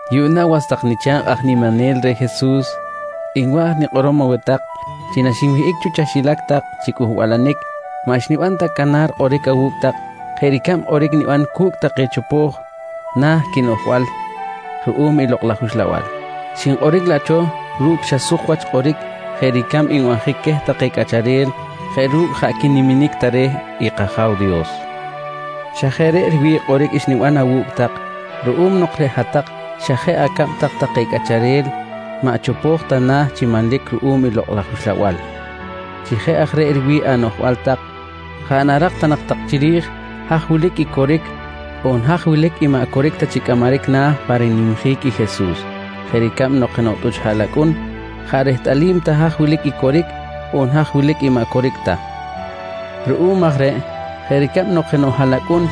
Yuꞌna was tak nicha̱kꞌ aj niminel reh Jesus, nwa̱j nikꞌorom aweh tak chi naxinwihꞌic cho chaxilac tak chi cꞌuhbalanic maꞌ xniban ta canar kꞌoric awu̱cꞌ tak jeꞌ ricab kꞌoric niban cu̱cꞌ take chopo̱j nah quinoꞌjbal ruꞌum i Lokꞌ laj Uxlabal, xinkꞌoric laꞌ cho ru̱cꞌ xa suk wach kꞌoric jeꞌ ricab nbanjic queh take cꞌacharel jeꞌ ru̱cꞌ jaꞌ quiniminic ta reh i kAja̱w Dios. Xa jeꞌ reꞌ riwi̱ꞌ kꞌoric xniban awu̱cꞌ tak ruꞌum nok reꞌ hat-tak xa jeꞌ acab tak take cꞌacharel maꞌ chopo̱j ta nah chi manlic ruꞌum i Lokꞌ laj Uxlabal. Chi jeꞌ aj reꞌ riwi̱ꞌ anoꞌjbal tak, jaꞌ narak ta nak tak chiri̱j haj wilic i coric on haj wilic i maꞌ coric ta chi cꞌamaric na̱ pa rinimjic i Jesus jeꞌ ricab nok jenoꞌ tꞌuch haꞌlacꞌun jaꞌ rehtꞌalim ta haj wilic i coric on haj wilic i maꞌ coric ta. Ruꞌum aj reꞌ jeꞌ ricab nok jenoꞌ haꞌlacꞌun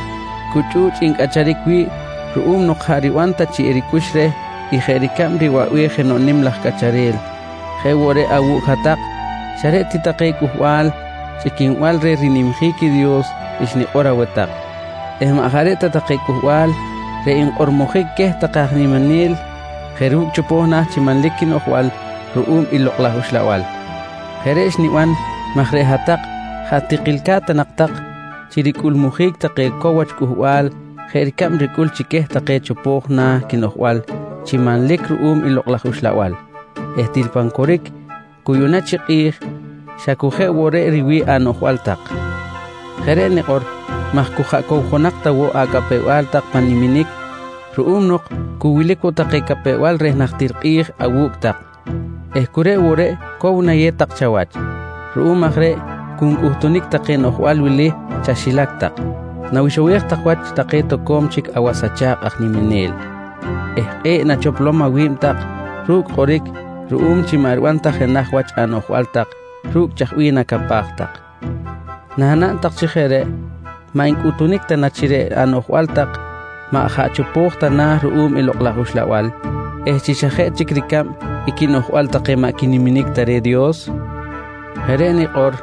cu chꞌu̱chꞌ ncꞌacharic wi̱ꞌ ruꞌum nok jaꞌ riban ta chi ricꞌux reh i jeꞌ ricab riwaꞌbej jenoꞌ nim laj cꞌacharel, jeꞌ woꞌ reꞌ awu̱cꞌ hat-tak xa reꞌ ti take cꞌuhbal chꞌiquinbal reh rinimjic i Dios xnikꞌor aweh tak eh maꞌ jaꞌ reꞌ ta take cꞌuhbal reꞌ nkꞌormojic queh take aj niminel jeꞌ ru̱cꞌ chopo̱j na̱ chi manlic quinoꞌjbal ruꞌum i Lokꞌ laj Uxlabal. Jeꞌ reꞌ xniban maj reꞌ hat-tak jaꞌ tikilca̱t ta nak tak chi ricꞌulmujic take cow wach cꞌuhbal jeꞌ ricab ricꞌul chi queh take chopo̱j nah quinoꞌjbal chi manlic ruꞌum i Lokꞌ laj Uxlabal eh til pan coric cu yuꞌna chi kꞌi̱j xa cu jeꞌ woꞌ reꞌ riwi̱ꞌ anoꞌjbal tak. Jeꞌ reꞌ nikꞌor maj cu jaꞌ cowjonak ta woꞌ acapew-bal tak pan niminic ruꞌum nok cu wilic woꞌ take capew-bal reh najtir kꞌi̱j awu̱cꞌ tak eh cu reꞌ woꞌ reꞌ cow nayew tak chawach. Ruꞌum aj reꞌ cu ncꞌutunic take noꞌjbal wili chaxilac tak: Nawixowej tak wach take toco̱m chic awas acha̱kꞌ aj niminel eh kꞌe̱ꞌ nachoplom awi̱b tak ru̱cꞌ kꞌoric ruꞌum chi maꞌ riban ta jenaj wach anoꞌjbal tak ru̱cꞌ chaj bih nacapaj tak. Nanaꞌn tak chi jeꞌ reꞌ, maꞌ ncꞌutunic ta na chi reꞌ anoꞌjbal tak maꞌ jaꞌ chopo̱j ta nah ruꞌum i Lokꞌ laj Uxlabal eh chi xa jeꞌ chic ricab i quinoꞌjbal take maꞌ quiniminic ta reh i Dios? Jeꞌ reꞌ nikꞌor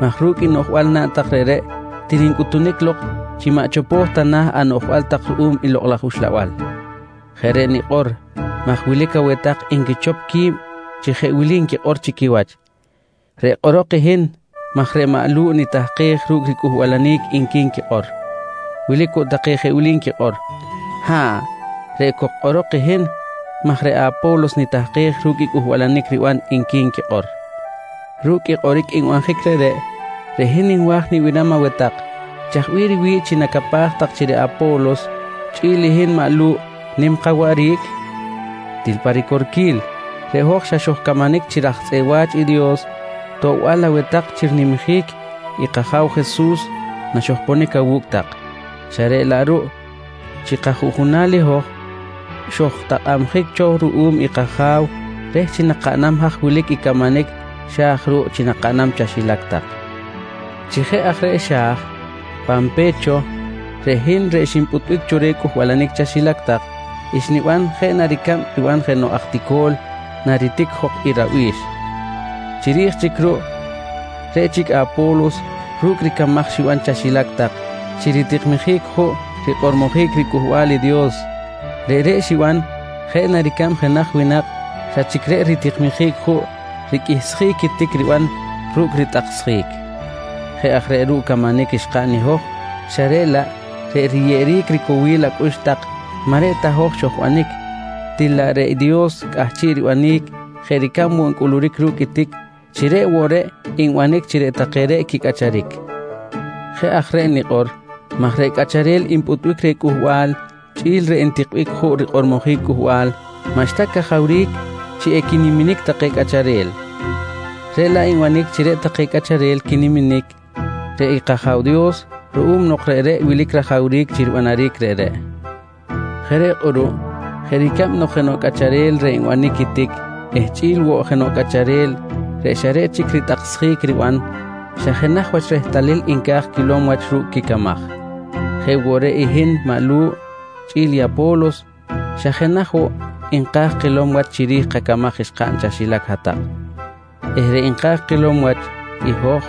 maj ru̱cꞌ i noꞌjbal naꞌn tak reꞌreꞌ til ncꞌutunic lok chi maꞌ chopo̱j ta na̱ anoꞌjbal tak ruꞌum i Lokꞌ laj Uxlabal. Jeꞌ reꞌ nikꞌor maj wilic aweh tak nquichop qui̱b chi jeꞌ wili nquikꞌor chi quiwach: «Reꞌ kꞌorok i hin maj reꞌ maꞌ Lu̱ꞌ nitahkej ru̱cꞌ ricꞌuhbalanic, nqui nquikꞌor. Wilic woꞌ take jeꞌ wili nquikꞌor: «Ha̱ꞌ, reꞌ cok kꞌorok i hin maj reꞌ maꞌ Apo̱los nitahkej ru̱cꞌ i cꞌuhbalanic riban, nqui nquikꞌor. Ru̱cꞌ i kꞌoric nbanjic reꞌreꞌ, reꞌ hin nwa̱j nibiram aweh tak, chaj bih riwi̱ꞌ chi nacapaj tak chi reꞌ Apo̱los chꞌi̱l i hin maꞌ Lu̱ꞌ nim kawaꞌric? Til pa ricorquil reꞌ hoj xa xojcamanic chi raj tzꞌeꞌ wa̱ch i Dios toꞌbal aweh tak chi rinimjic i kAja̱w Jesus naxojponic awu̱cꞌ tak xa reꞌ laꞌ ruꞌ chi kajuꞌjunal i hoj, xojtakꞌabjic cho ruꞌum i kAja̱w reh chi nakaꞌnam haj wilic i camanic xa̱j ruꞌ chi nakaꞌnam chaxilac tak. Chi jeꞌ aj reꞌ xa̱j, pan pe̱t cho reꞌ hin reꞌ xinpꞌutbic cho reh cꞌuhbalanic chaxilac tak, xniban jeꞌ na ricab riban jenoꞌ aj tico̱l naritic jok i rabi̱x. Chiri̱j chic ruꞌ, reꞌ chic Apo̱los ru̱cꞌ ricamaj xiban chaxilac tak chi ritikmijic juꞌ rikꞌormojic riCꞌuhbal i Dios, reꞌreꞌ xiban jeꞌ na ricab jenaj winak xa chic reꞌ ritikmijic juꞌ riqꞌuihsjic i tic riban ru̱cꞌ ritꞌaksjic. Jeꞌ aj reꞌ ruꞌ camanic xkaꞌn i hoj xa reꞌ laꞌ reꞌ riyeꞌeric ricowil acꞌux tak maꞌ reꞌ ta hoj xojbanic, til laꞌ reꞌ i Dios cꞌahchiꞌ ribanic jeꞌ ricab woꞌ ncꞌuluric ru̱cꞌ i tic chi reꞌ woꞌ reꞌ nbanic chi reꞌ take reꞌ quicꞌacharic. Jeꞌ aj reꞌ nikꞌor maj reꞌ cꞌacharel npꞌutbic reh cꞌuhbal chꞌi̱l reꞌ ntikbic juꞌ rikꞌormojic cꞌuhbal maꞌxta cajawric chi equiniminic take cꞌacharel, reꞌ laꞌ nbanic chi reꞌ take cꞌacharel quiniminic, reꞌ i kAja̱w Dios ruꞌum nok reꞌ wilic rajawric chi ribanaric reꞌreꞌ. Jeꞌ reꞌ kꞌuruꞌ jeꞌ ricab nok jenoꞌ cꞌacharel reꞌ nbanic i tic eh chꞌi̱l woꞌ jenoꞌ cꞌacharel reꞌ xa reꞌ chic ritꞌaksjic riban, xa jenaj wach i rehtalil nca̱j quilom wach ru̱cꞌ quicamaj, jeꞌ woꞌ reꞌ hin maꞌ Lu̱ꞌ chꞌi̱l i Apo̱los xa jenaj woꞌ nka̱j kilom wach chiri̱j kacamaj xkaꞌn chaxilac hat-tak eh reꞌ nka̱j kilom wach i hoj,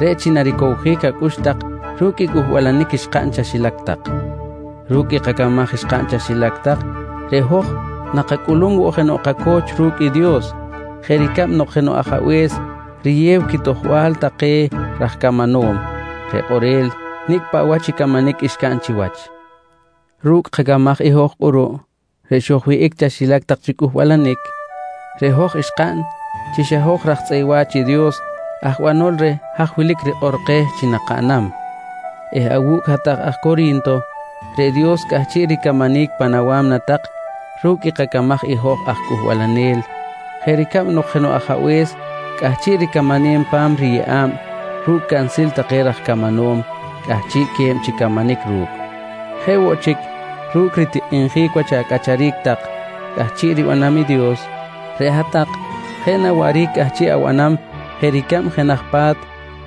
reꞌ chi naricowjic acꞌux tak ru̱cꞌ i cꞌuhbalanic xkaꞌn chaxilac tak. Ru̱cꞌ i kacamaj xkaꞌn chaxilac tak, reꞌ hoj nakacꞌulum woꞌ jenoꞌ kaco̱ch ru̱cꞌ i Dios jeꞌ ricab nok jenoꞌ ajabe̱s riyew quitojbal take raj camanom reꞌ kꞌorel nicꞌ paꞌ wach i camanic xcaꞌn chiwach. Ru̱cꞌ kacamaj i hoj kꞌuruꞌ reꞌ xojwihꞌic cho chaxilac tak chi cꞌuhbalanic, reꞌ hoj xkaꞌn chi xa hoj raj tzꞌeꞌ wa̱ch i Dios aj banol reh haj wilic rikꞌor keh chi nakaꞌnam eh awu̱cꞌ hat-tak aj Cori̱nto reꞌ Dios cꞌahchiꞌ ricamanic pan awa̱mna tak ru̱cꞌ kacamaj i hoj aj cꞌuhbalanel jeꞌ ricab nok jenoꞌ ajabe̱s cꞌahchiꞌ ricamanem pan riyeꞌa̱b ru̱cꞌ cansil take raj camanom cꞌahchiꞌque̱b chi camanic ru̱cꞌ. Jeꞌ woꞌ chic ru̱cꞌ ritikꞌinjic wach acꞌacharic tak cꞌahchiꞌ ribanam i Dios, reꞌ hat-tak jeꞌ na waꞌric cꞌahchiꞌ abanam jeꞌ ricab jenaj pa̱t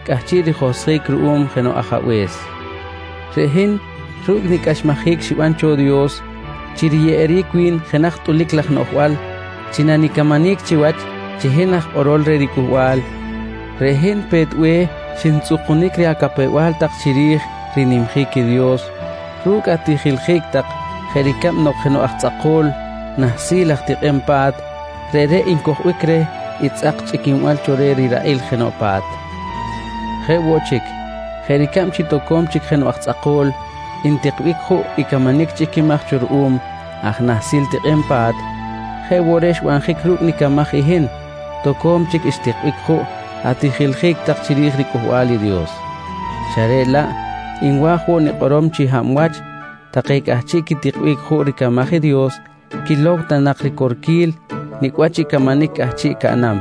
cꞌahchiꞌ rijohsjic ruꞌum jenoꞌ ajabe̱s. Reꞌ hin ru̱cꞌ nicꞌaxmajic xiban cho Dios chi riyeꞌeric wi̱n jenaj tꞌulic laj noꞌjbal chi nanicamanic chiwach chi hin aj kꞌorol reh riCꞌuhbal, reꞌ hin pe̱t be̱h xintzꞌukunic reh acapew-bal tak chiri̱j rinimjic i Dios ru̱cꞌ atijiljic tak jeꞌ ricab nok jenoꞌ aj tzꞌako̱l nahsil aj tikꞌem pa̱t, reꞌreꞌ ncojbic reh i tzꞌak chꞌiquinbal cho reh riraꞌil jenoꞌ pa̱t. Jeꞌ woꞌ chic, jeꞌ ricab chi toco̱m chic jenoꞌ aj tzꞌako̱l ntikbic juꞌ i camanic chꞌiquimaj cho ruꞌum aj nahsil tikꞌem pa̱t, jeꞌ woꞌ reꞌ xbanjic ru̱cꞌ i nicamaj i hin toco̱m chic xtikbic juꞌ atijiljic tak chiri̱j riCꞌuhbal i Dios. Xa reꞌ laꞌ nwa̱j woꞌ nikꞌorom chi hab wach take cꞌahchiꞌ quitikbic juꞌ ricamaj i Dios quilow ta nak ricorquil nicꞌ wach i camanic cꞌahchiꞌ caꞌnam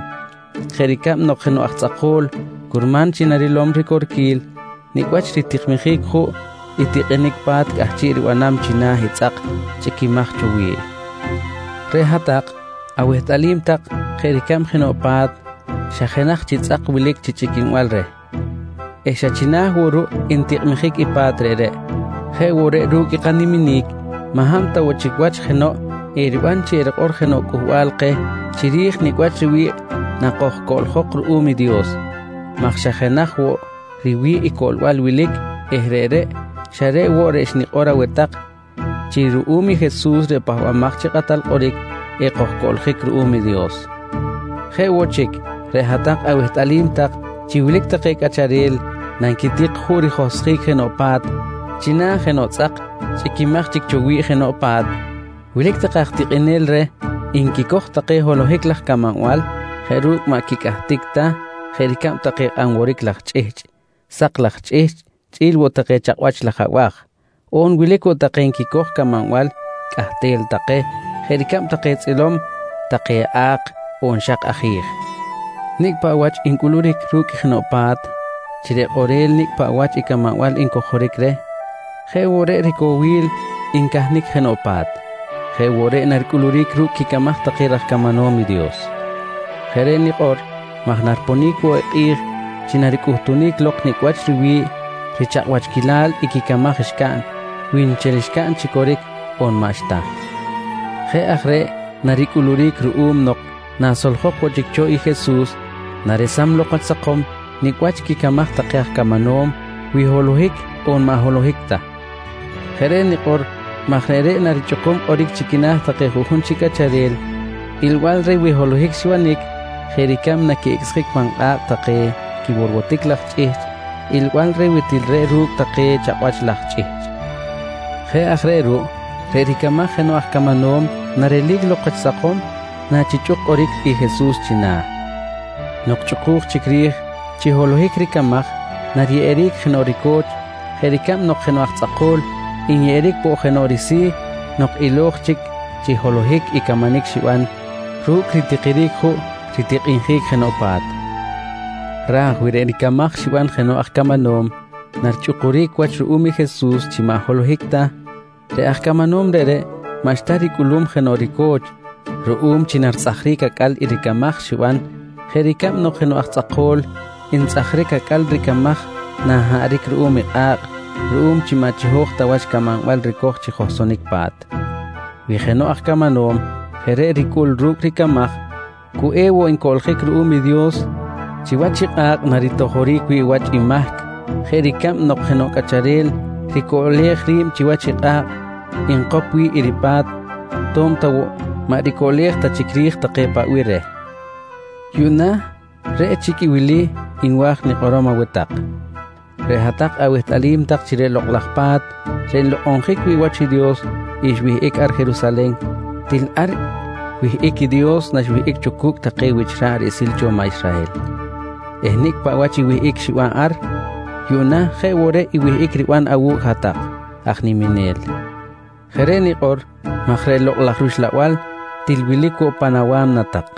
jeꞌ ricab nok jenoꞌ aj tzꞌako̱l, curman chi narilom ricorquil nicꞌ wach ritikmijic juꞌ i tikꞌinic pa̱t cꞌahchiꞌ ribanam china̱ i tzꞌak chꞌiquimaj cho wi̱ꞌ. Reꞌ hat-tak awehtꞌalim tak jeꞌ ricab jenoꞌ pa̱t xa jenaj chi tzꞌak wilic chi chꞌiquinbal reh eh xa china̱ woꞌ ruꞌ ntikꞌmijic i pa̱t reꞌreꞌ, jeꞌ woꞌ reꞌ ru̱cꞌ i kaniminic maꞌ hab ta woꞌ chic wach jenoꞌ eriban chi erikꞌor jenoꞌ cꞌuhbal keh chiri̱j nicꞌ wach riwi̱ꞌ nakojcoꞌljok ruꞌum i Dios maj xa jenaj woꞌ riwi̱ꞌ i coꞌlbal wilic eh reꞌreꞌ, xa reꞌ woꞌ reꞌ xnikꞌor aweh tak chi xa ruꞌum i Jesus reꞌ Pahbamaj chi Kꞌatal Kꞌoric ekojcoꞌljic ruꞌum i Dios. Jeꞌ woꞌ chic, reꞌ hat-tak awehtꞌalim tak chi wilic take cꞌacharel nanquitik juꞌ rijohsjic jenoꞌ pa̱t china̱ jenoꞌ tzꞌak chꞌiquimaj chic cho wi̱ꞌ jenoꞌ pa̱t, wilic take aj tikꞌinel reh nquicoj take holohic laj camanbal jeꞌ ru̱cꞌ maꞌ quicꞌahtic ta jeꞌ ricab take kꞌanworic laj chꞌihchꞌ, sak laj chꞌihchꞌ chꞌi̱l woꞌ take chakꞌwach laj abaj on wilic woꞌ take nquicoj camanbal cꞌahtel take jeꞌ ricab take tzꞌilom, take a̱k on xak aji̱j. Nicꞌ paꞌ wach ncꞌuluric ru̱cꞌ jenoꞌ pa̱t chi reꞌ kꞌorel nicꞌ paꞌ wach i camanbal ncojoric reh jeꞌ woꞌ reꞌ cowil ncahnic jenoꞌ pa̱t, jeꞌ woꞌ reꞌ naricꞌuluric ru̱cꞌ quicamaj take raj camanom i Dios. Jeꞌ reꞌ nikꞌor maj nariponic woꞌ i kꞌi̱j chi naricꞌutunic lok nicꞌ wach riwi̱ꞌ richakꞌwachquilal i quicamaj xcaꞌn, wi nchel xcaꞌn chi coric on maꞌxta. Jeꞌ aj reꞌ naricꞌuluric ruꞌum nok nasoljok woꞌ chic cho i Jesus naresam lok wach sakom nicꞌ wach quicamaj take aj camanom wi holohic on maꞌ holohic ta. Jeꞌ reꞌ nikꞌor maj reꞌreꞌ narichꞌukum kꞌoric chi quina̱ juꞌjun chi cꞌacharel ilbal reh wi holohic xibanic jeꞌ ricab naquiꞌicꞌsjic pan kꞌa̱kꞌ take quiworwotic laj chꞌihchꞌ ilbal reh wi til reꞌ ru̱cꞌ take chakꞌwach laj chꞌihchꞌ. Jeꞌ aj reꞌ ruꞌ, reꞌ ricamaj jenoꞌ aj camanom narelic lok wach sakom nachichꞌuk kꞌoric i Jesus china̱. Nok chꞌuku̱j chic ri̱j chi holohic ricamaj, nariyeꞌeric jenoꞌ rico̱ch jeꞌ ricab nok jenoꞌ aj tzꞌako̱l nyeꞌeric woꞌ jenoꞌ risi̱ nok ilo̱j chic chi holohic i camanic xiban ru̱cꞌ ritikiric juꞌ ritikꞌinjic jenoꞌ pa̱t. Raj wi reꞌ ricamaj xiban jenoꞌ aj camanom narichꞌukuric wach ruꞌum i Jesus chi maꞌ holohic ta, reꞌ aj camanom reꞌreꞌ maꞌxta ricꞌulum jenoꞌ rico̱ch ruꞌum chi naritzꞌajric acꞌal i ricamaj xiban jeꞌ ricab nok jenoꞌ aj tzꞌako̱l ntzꞌajric acꞌal ricamaj nanhaꞌric ruꞌum kꞌa̱kꞌ ruꞌum chi maꞌ chiho̱j ta wach camanbal ricoj chi johsonic pa̱t. Wi jenoꞌ aj camanom jeꞌ reꞌ ricꞌul ru̱cꞌ ricamaj, cu ewoꞌ ncoꞌljic ruꞌum i Dios chiwach i kꞌa̱kꞌ naritojoric wi̱ꞌ wach i mahc jeꞌ ricab nok jenoꞌ cꞌacharel ricoꞌlej ri̱b chiwach i kꞌa̱kꞌ nkop wi̱ꞌ i ripa̱t to̱b ta woꞌ maꞌ ricoꞌlej ta chic ri̱j take paꞌ bih reh. Yuꞌna reꞌ chic wili nwa̱j nikꞌorom aweh tak: Reꞌ hat-tak awehtꞌalim tak chi reꞌ Lokꞌ laj Pa̱t reꞌ nlokꞌonjic wi̱ꞌ wach i Dios xwihꞌic ar Jerusalen, til ar wihꞌic i Dios naxwihꞌic cho cu̱cꞌ take wich ra̱ꞌ riꞌsil cho maꞌ Israhel eh nicꞌ paꞌ wach i wihꞌic xiban ar, yuꞌna jeꞌ woꞌ reꞌ i wihꞌic riban awu̱cꞌ i hat-tak aj niminel. Jeꞌ reꞌ nikꞌor maj reꞌ Lokꞌ laj rUxlabal til wilic woꞌ pan awa̱mna tak.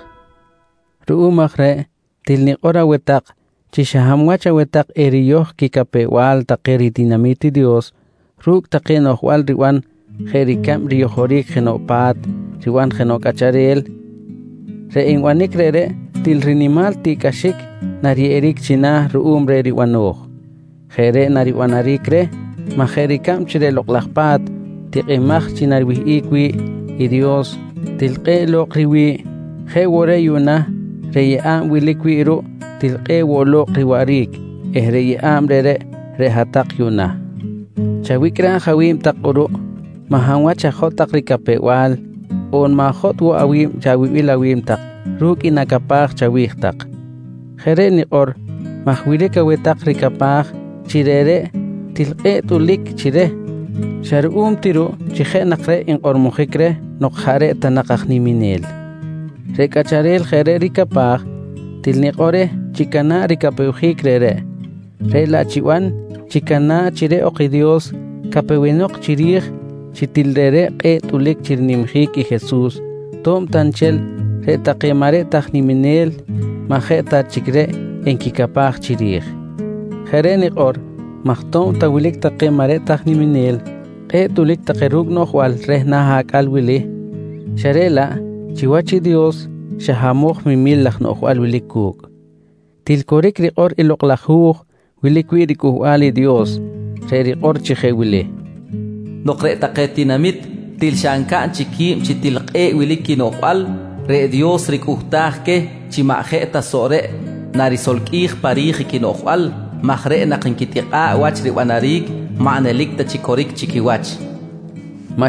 Ruꞌum aj reꞌ til nikꞌor aweh tak chi xa hab wach aweh tak eriyoj quicapew-bal take ritinami̱t i Dios ru̱cꞌ take noꞌjbal riban jeꞌ ricab riyojoric jenoꞌ pa̱t riban jenoꞌ cꞌacharel, reꞌ nbanic reꞌreꞌ til rinimal tiꞌcꞌaxic nariyeꞌeric china̱ ruꞌum reh ribano̱j. Jeꞌ reꞌ naribanaric reh maj jeꞌ ricab chi reꞌ Lokꞌ laj Pa̱t tikꞌimaj chi nariwihꞌic wi̱ꞌ i Dios, til kꞌe̱ꞌ lo̱kꞌ riwi̱ꞌ, jeꞌ woꞌ reꞌ yuꞌna reꞌ yeꞌa̱b wilic wi̱ꞌ ruꞌ til kꞌe̱ꞌ woꞌ lo̱kꞌ riwaꞌric eh reꞌ yeꞌa̱b reꞌreꞌ, reꞌ hat-tak yuꞌna. Chawicꞌraj awi̱b tak kꞌuruꞌ maꞌ hab wach ajotꞌ tak ricapew-bal on ma̱jotꞌ woꞌ awi̱b chawibil awi̱b tak ru̱cꞌ i nacapaj chawi̱j tak. Jeꞌ reꞌ nikꞌor maj wilic aweh tak ricapaj chi reꞌreꞌ til kꞌe̱ꞌ tꞌulic chi reh xa ruꞌum ti ruꞌ chi jeꞌ nak reꞌ nkꞌormojic reh nok jaꞌ reꞌ ta nak aj niminel. Reꞌ cꞌacharel jeꞌ reꞌ ricapaj til nikꞌor reh chicana̱ꞌ ricapewjic reꞌreꞌ, reꞌ laꞌ chiban chicana̱ꞌ chi reꞌ ok chic i Dios capewenok chiri̱j chi til reꞌreꞌ kꞌe̱ꞌ tꞌulic chi rinimjic i Jesus to̱b ta nchel reꞌ take maꞌ reꞌ ta aj niminel maꞌ jeꞌ ta chic reꞌ nquicapaj chiri̱j. Jeꞌ reꞌ nikꞌor maj to̱b ta wilic take maꞌ reꞌ ta aj niminel kꞌe̱ꞌ tꞌulic take ru̱cꞌ noꞌjbal reh na̱ acꞌal wili xa reꞌ laꞌ chiwach i Dios xa hamoj memil laj noꞌjbal wilic cu̱cꞌ. Til coric rikꞌor i Lokꞌ laj Hu̱j wilic wi̱ꞌ i riCꞌuhbal i Dios, reꞌ rikꞌor chi jeꞌ wili: “Nok reꞌ take tinamit til xa ncaꞌn chic qui̱b chi til kꞌe̱ꞌ wilic quinoꞌjbal, reꞌ Dios ricꞌuhtaj queh chi maꞌ jeꞌ ta soꞌ reꞌ narisolqꞌuij pa ri̱j i quinoꞌjbal maj reꞌ nak nquitikꞌa̱ꞌ wach ribanaric maꞌ nelic ta chi coric chi quiwach, nqui rikꞌor.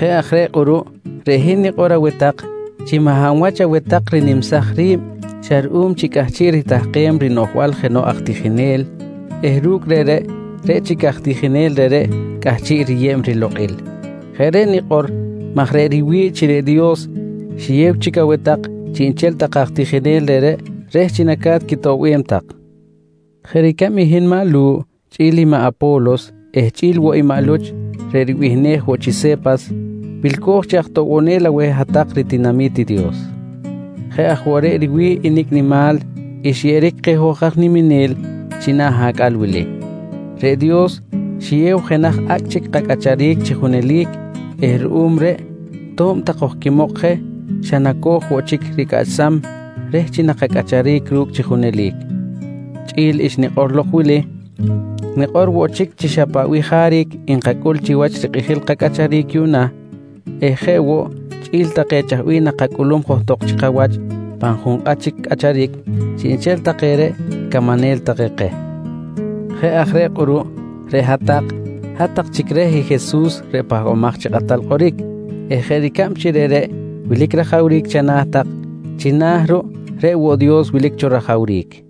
Jeꞌ aj reꞌ kꞌuruꞌ reꞌ hin nikꞌor aweh tak chi maꞌ hab wach aweh tak rinimsaj ri̱b xa ruꞌum chi cꞌahchiꞌ ritahkem rinoꞌjbal jenoꞌ aj tijinel eh ru̱cꞌ reꞌreꞌ, reꞌ chic aj tijinel reꞌreꞌ cꞌahchiꞌ riyeb rilokꞌil. Jeꞌ reꞌ nikꞌor maj reꞌ riwi̱ꞌ chi reꞌ Dios xiyew chic aweh tak chiꞌnchel take aj tijinel reꞌreꞌ reh chi naca̱t quitoꞌbem tak. Jeꞌ ricab i hin maꞌ Lu̱ꞌ chꞌi̱l i maꞌ Apo̱los eh chꞌi̱l woꞌ i maꞌ Luch reꞌ ribihnej woꞌ chi Se̱pas, wilco̱j chi aj toꞌbonel aweh hat-tak ritinami̱t i Dios. Jeꞌ aj woꞌ reꞌ riwi̱ꞌ i nicꞌ nimal xyeꞌeric keh hoj aj niminel china̱ acꞌal wili. Reꞌ Dios xiyew jenaj acꞌ chic kacꞌacharic chi junelic eh ruꞌum reꞌ to̱b ta kojquimok je xa naco̱j woꞌ chic ricꞌaꞌchsam reh chi nakacꞌacharic ru̱cꞌ chi junelic. Chꞌi̱l xnikꞌor lok wili nikꞌor woꞌ chi xa paꞌ bih jaric nkacꞌul chiwach rikꞌijil kacꞌacharic yuꞌna eh jeꞌ woꞌ chꞌi̱l take chaj bih nakacꞌulum johtok chi kawach pan junkꞌat chic cꞌacharic, chiꞌnchel take reꞌ camanel take keh. Jeꞌ aj reꞌ kꞌuruꞌ reꞌ hat-tak, hat-tak chic reh i Jesus reꞌ Pahbamaj chi Kꞌatal Kꞌoric eh jeꞌ ricab chi reꞌreꞌ wilic rajawric chana̱ tak, china̱ ruꞌ reꞌ woꞌ Dios wilic cho rajawric.